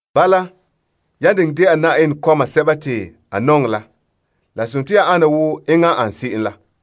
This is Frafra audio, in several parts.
Bala, yan diŋɛ dɛna Yenɛ kɔma sɛba te a nɔŋɛ la, la sontii ya ana wo enŋa n an se'em la.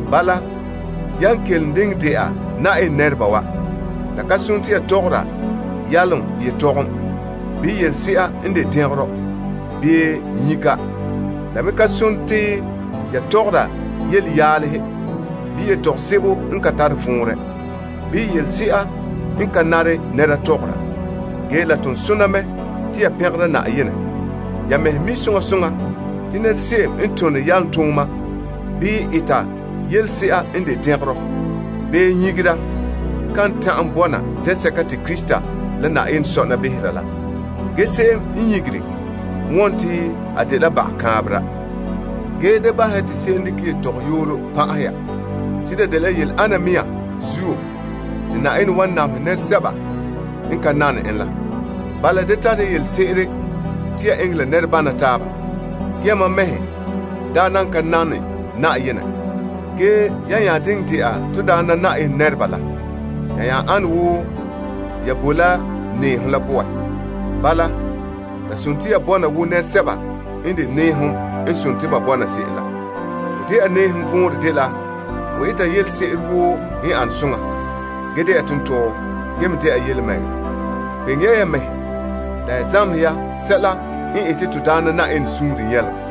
Bala, yan kelom diŋɛ dɛna Yenɛ nɛreba wa, la ka nare te ya tɔgɔra yalom yetɔgom, bii yelese'a n de dɛngerɔ, bii nyika. La me da tɔgɔra yelenyalehe, bii yetɔgom sebo n ka tare vɔnrɛ, bii yelese'a n ka nare nɛra tɔgɔra. Ge, la ton sona mɛ te ya pɛngera Yenɛ. Ya mɛhe mi' soŋa soŋa te nɛra se'em n tone yalomtooma, bii eta yelese'a n de dɛngerɔ, bii nyigera kan ta'an bɔna zen'sɛka te Krista la Yenɛ sɔna behera la. Nyika la dela baga kaanbegɔ. Ge, da bahɛ ya te se'em dekɛ yetɔgɔyooro pan'ahɛ ya. Te la dela yele ana mɛŋa zuo te Yenɛ wan namehɛ nɛresɛba n ka nane en la. Bala, da tare ya yelese'ere te ya eŋɛ la nɛre bama taaba. Ge yamam mɛhe daa nan boe lika poan. Ge yan nya de Na'ayenɛ nɛreba la, ya nya boe la nɛɛhom la poan. Bala, ya bɔna wo nɛresɛba n de nɛɛhom n boe se'em la. Ho dɛna nɛɛhom vɔnrɛ dela ho eta yelese'ere woo n ane soŋa, ge dɛna tontɔɔ, ge me dɛna yelemɛŋɛrɛ. Kpeŋe ya ya mɛhe la ya zamehe ya sɛla n ete Na'ayenɛ suunre nyɛlom.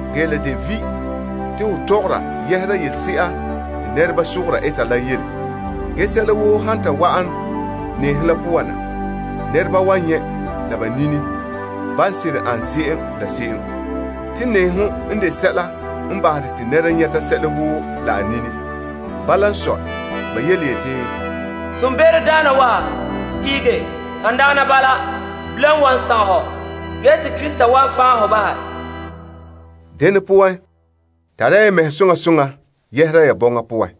La de vi' te ho tɔgɔra yɛhera yelese'a te nɛreba sogora eta la yele Ge sɛla woo han ta wa'an nɛɛhom la poan na, nɛreba wan nyɛ' la ba nini ban seren ane se'em. Te nɛɛhom n de sɛla n bahere te nɛra nyɛta sɛla woo la a nini. Bala n sɔe, te ba yeti, Be'em daana wa, ihege. Han dagana bala, la wan sagom hɔ, wa'ana te Krista fan' hɔ. Dene poan, tare ya mɛŋa soŋa soŋa yɛhera ya bɔŋa poan.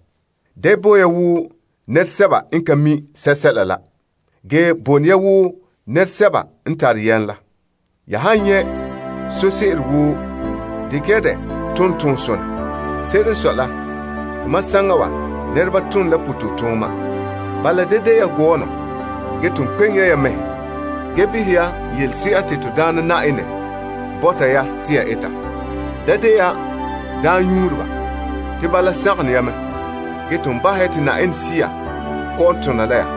Da bo ya wo nɛresɛba n ka mi' sɛsɛla la, ge boe ne ya wo nɛresɛba n tare yam la. Ya han nyɛ' sose'ere woo, dekɛ ya dɛ tom toonsonɛ. Se'ere n sɔe la, Tomam saŋa wa, nɛreba tona toonfɛn'ɛha. Bala, da de ya gɔɔnɔ, ge ton kpeŋe ya ya mɛhe mina sɛla te Na'ayenɛ bɔta ya te ya eta. Da de ya daamnyuureba, te bala sagom ne ya me. Ge ton bahɛ ya te Yenɛ Sea kɔ'ɔn tona la ya.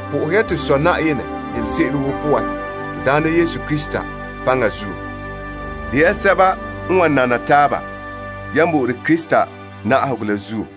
Po'ohe ya to Sɔ enɛ yelese'ere woo poan to Na'ayenɛ Yesu Krista paŋa poan. De ya sɛba n wan nana taaba yan bo'ore Krista na'ahegɔ la.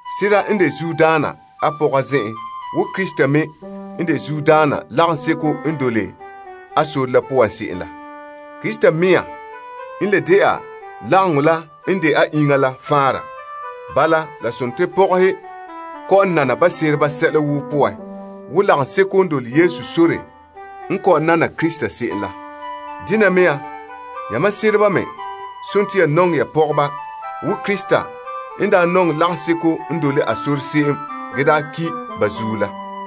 Sera n de zuodaana a pɔga zen'en wo Krista me n de zuodaana lagaŋɔ la poan se'em la. Krista mɛŋa n de lagaŋɔ n de a iŋa la faanra. Bala, pɔgɔhe kɔ'ɔn nana ba sereba sɛla woo poan wo lagaŋɔ kɔ'ɔn nana Krista se'em la. Dene mea, yamam sereba me, ya nɔŋɛ ya pɔgɔba wo Krista n daa nɔŋɛ lagaŋɔ la se'em ge ki' ba zuo la.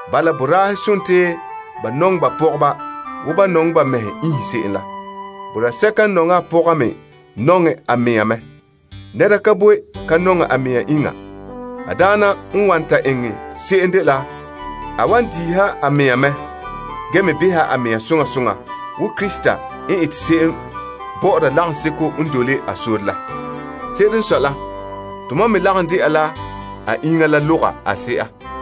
Bala mea, boraahe nɔŋɛ ba pɔgɔba wo ban nɔŋɛ ba mɛhe iinhe se'em la. Se'em n nɔŋɛ a pɔga me nɔŋɛ a mɛŋa mɛ. Nɛra ka boe ka nɔŋɛ a mɛŋa iŋa. A daana n wan to eŋɛ se'em dela a wan diiha a mea mɛ gee me beha a mea soŋa soŋa wo Krista n ete se'em bɔ'ɔra lagaŋɔ la. Se'ere n sɔe la, tomam me lagom dɛna la a iŋa la loga a se'a.